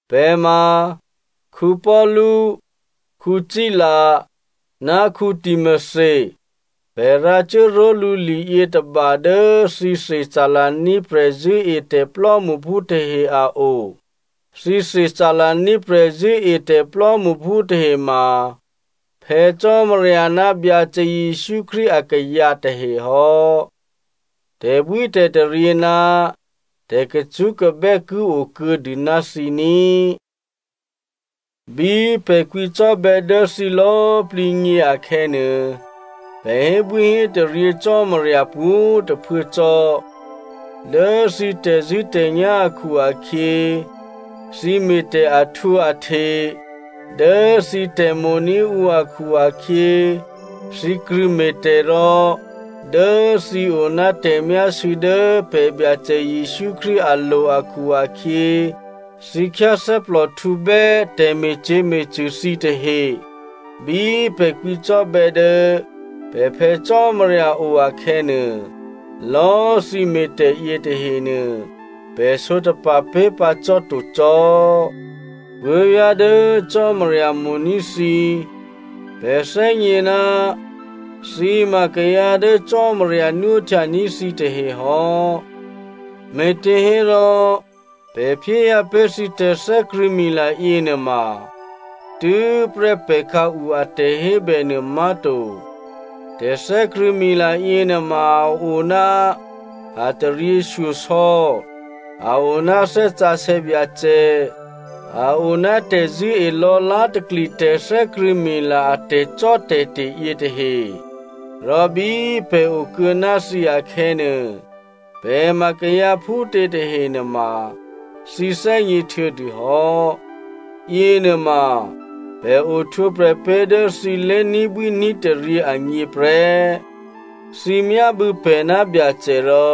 Pè̤ ma Paulu, Sila, ná Timothy. Pè̤ rǎcuố ró̤lǔ liyětôba dố thǐ Thessalonia prè̤zṳ̂́etè̤ plò́mṳphú tahe a o. Thǐ Thessalonia prè̤zṳ̂́etè̤ plò́mṳphú tahe ma Phè̌ Cò́marya ná Byacè Jesǔ Krístu akayǎ tahe hò́. Tè̤bwítè̤taryě ná tè̤kacṳ́kabè́ ki okuô̌dû ná thǐ ní꤮. Bí pè̤ kwǐcò́bè̌ dố thǐ lò̌꤮ plǐ gně akhè̌nuô, pè̤ hébwíhétaryě Cò́marya pwǒ̤꤮ tôphuố cò́. Dố thǐ tè̤zṳ̂́tè̤nyá̤ akhu-akhyě, thǐ me̤tè̤ ahtwǒahte, dố thǐ tè̤mo̤ní̤ ǔ akhu-akhyě, thǐ krṳ̂̌me̤ tè̤, rò dố thǐ o ná tè̤myásû̌ dố pè̤ Byacè Jesǔ Krístu alo̤ akhu-akhyě, thǐ khyáthè́plòhtǔbè́ tè̤me̤cyě̤me̤cṳ̂ thǐ tahe. Bí pè̤ kwǐcò́bè̌ dố pè̤ Phè̌ Cò́marya o akhè̌nuô, lò̌꤮ thǐ me̤tè̤ yětahenuô, pè̤ sǒtapa̤ pé̤pǎ cò́ to cò́. Puố̤vyá̤ dố Cò́marya mo̤ní̤ thǐ, pè̤ thè́gně ná thǐ ma kayǎ dố Cò́marya nwóhtyaní̤ thǐtahe hò́. Me̤těhérò pè̤ phyéhyǎ pé̤ thǐ tè̤thè́krṳ̂̌mila yěnuôma tû́prè́ pè̤ khǎu a tè̤hébè nuômá̤to. Tè̤thè́krṳ̂̌mila yěnuôma, a o ná a taryěshyosò̌, a o ná Thè́ Sǎsè̌ Byacè, a o ná tè̤zṳ̂́e lò̌lá̤takli tè̤thè́krṳ̂̌mila a tè̤cò́tè̤te̤ yětahe. Rò bí pè̤ okuô̌ ná thǐ akhè̌nuô, pè̤ ma kayǎ phútě tahenuôma, thǐ thè́gně htuô̌dûhò́. Yěnuôma pè̤ ohtwǒprè̤ pé̤ dố thǐ lé̤ní̤bwí ní̤taryě agně prè́. Thǐ myábû̌ pè̤ ná Byacè rò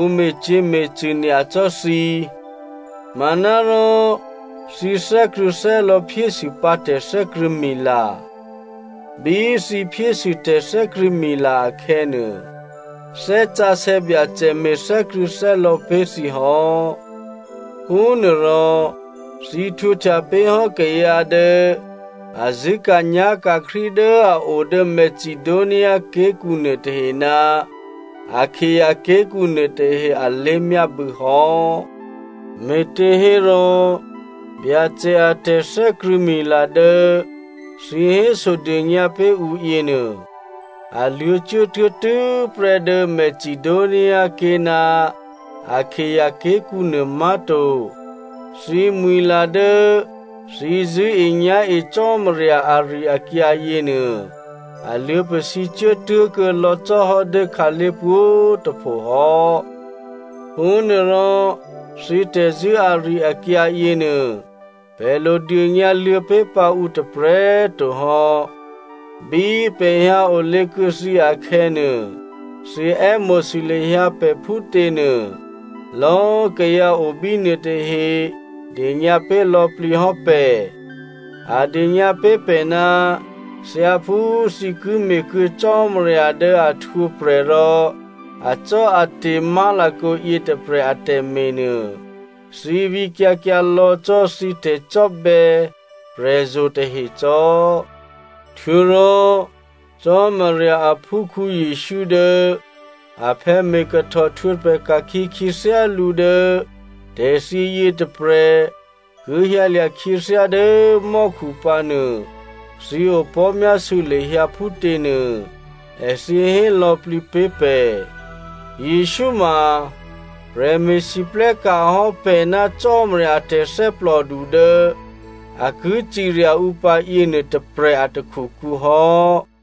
ǔ me̤cyě̤me̤cṳ̂ nyacò́ thǐ, manárò thǐ thè́krṳ̂̌thè́lò̌ phyésûpǎ tè̤thè́krṳ̂̌mila. Bí thǐ phyésû tè̤thè́krṳ̂̌mila akhè̌nuô, Thè́ Sǎsè̌ Byacè me̤ thè́krṳ̂̌thè́lò̌ pé̤ thǐ hò́. Phúnuôrò thǐ htwǒhtya pé̤hò́ kayǎ dố a zṳ̂́ka̤nyá̤ka̤ Krístu dố a o dố Macedonia ké̤kǔ nuôtahe ná Akaia ké̤kǔ nuôtahe alé̤myábû̌ hò́. Me̤těhérò Byacè a tè̤thè́krṳ̂̌mila dố thǐ hésodônyǎ pé̤ ǔ yěnuô, a luô̌ cuốtuố tû́prè́ dố Macedoniaké̤ ná Akaia ké̤kǔ nuômá̤to. Thǐmwi̤la dố thǐ zṳ̂́enyá̤e Cò́marya ari-akyǎ yěnuô, a luô̌pasǐ cuốtuố kuô̌lò̌ cò́hò́ dố khǎlé̤ pwǒ̤꤮ tôpho hò́. Phúnuôrò thǐ tè̤zṳ̂́ ari-akyǎ yěnuô pè̤ lo dônyǎ luô̌pé̤pǎ ǔ tôprè̤꤮ to hò́. Bí pè̤ hyǎ olě kuô̌ thǐ akhè̌nuô, thǐ è́mo̤sû lahyǎ pè̤ phútěnuô, lò̌꤮ kayǎ o bínuô tahe dônyǎ pé̤ lò̌plǐ hò́ pè̤. A dônyǎ pé̤ pè̤ ná thyáphú thǐ ki me̤kuô̌ Cò́marya dố a htwǒprè̤ rò acò́ate̤ má̤lakǒ yětôprè̤ a tè̤me̤nuô, thǐ vǐkyǎ kyǎ lò̌ cò́ thǐ tè̤cò́bè̌ prè̤zo̤ tahe cò́. Htuô̌rò Cò́marya aphúkhǔ Jesǔ dố aphè̌ me̤ kahtò htwǒprè̤ ka̤khyě khyěthyá lǔ dố tè̤thyě yětôprè̤ ki hyǎlya̤ khyěthyá dố mò́khu pǎnuô thǐ opò̤́myásû̌ lahyǎ phútě nuô èthǐ hé lò̌plǐ pé̤ pè̤. Jesǔ ma prè̤me̤lwóhteka̤ hò́ pè̤ ná Cò́marya a tè̤thè́plòdu dố a ki cirya ǔ pǎ yěnuô tôprè̤ a takhukǔ hò́.